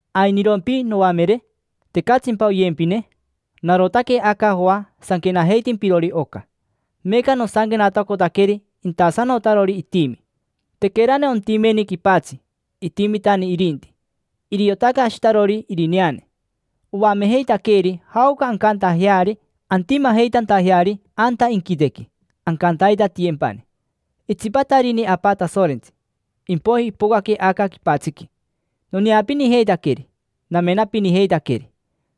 ¿Ainirompi, noamere? ¿Tecatsimpa oyempine? Narotaque aca Joa sanquenajeitimpirori oca. Meeca nosanquenatacotaqueri intasanotarori itimi. Tequerani ontimeni quipatsi, itimitani irinti. Iriotaque Ashitarori irineane, oamejeitaqueeri jaoca ancantajeari antimajeitantajeari anta inquitequi, ancantaitatiyempani. Itsipatarini Apa Tasorentsi, impoiji ipocaque aca quipatsiqui. Noneapinijeitaqueri, namenapinijeitaqueri,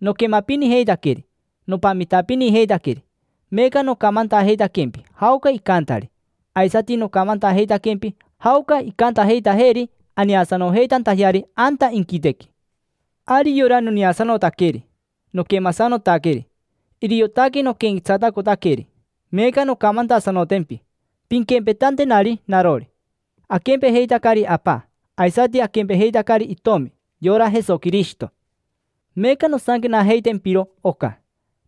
noquemapinijeitaqueri, nopamitapinijeitaqueri: meeca nocamantajeitaquempi jaoca icantari, aisati nocamantajeitaquempi jaoca incantajeitajeeri aneasanojeitantajeari anta inquitequi. Ari yora noneasanotaqueri, noquemasanotaqueri, iriotaque noquenquetsatacotaqueri. Meeca noncamantasanotempi, pinquempetantenari narori. Aquempejeitacari Apa, aisati aquempejeitacari itomi: yora Jesoquirishito. Meeca nosanquenajeitempiro oca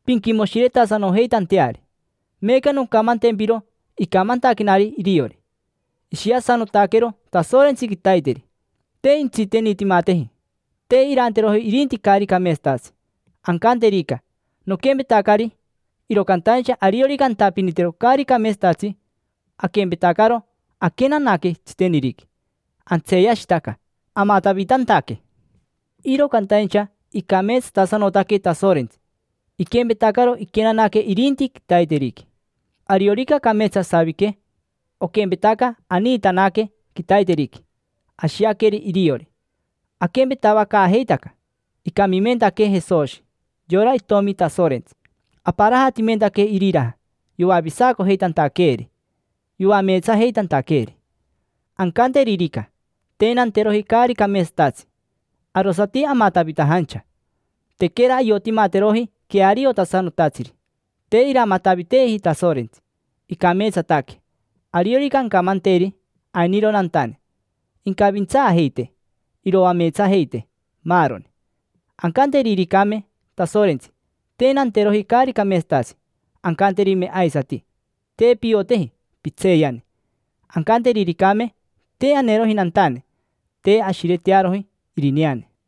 pinquimoshiretasanojeitanteari. Meeca noncamantempiro icamantaquenari iriori. Ishiasanotaquero Tasorentsi quitaiteri, te intsitenitimateji: te iranteroji irinti caari cameetsatatsi. Ancanterica: “Noquempetacari”, iro cantaincha ariorica antapinitero caari cameetsatatsi, aquempetacaro aquenanaque tsiteniriqui: antseeyashitaca, amatavitantaque. Iro cantaincha icameetsatasanotaque Tasorentsi, iquempetacaro iquenanaque irinti quitaiteriqui. Ariorica cameetsa asavique, oquempetaca aniitanaque quitaiteriqui, ashiaqueri iriori: aquempetavacaajeitaca. Icamimentaquee Jesoshi, yora Itomi Tasorentsi: aparajatimentaquee iriraja yoavisacojeitantaqueeri, yoameetsajeitantaqueeri. Ancanteririca: “Te nanteroji caari cameetsatatsi”, arosati amatavitajancha, tequera ayotimateroji queariotasanotatsiri. Te iramataviteeji Tasorentsi, icameetsataque. Ariorica ancamanteri: “Ainiro nantane”, incavintsaajeitee, iroameetsajeitee, maaroni. Ancanteriricame Tasorentsi: “Te nanteroji caari cameetsatatsi”, ancanterime aisati: “Te pioteji, pitseeyani”. Ancanteriricame: “Te aneroji nantane”, te ashiretearoji irineane.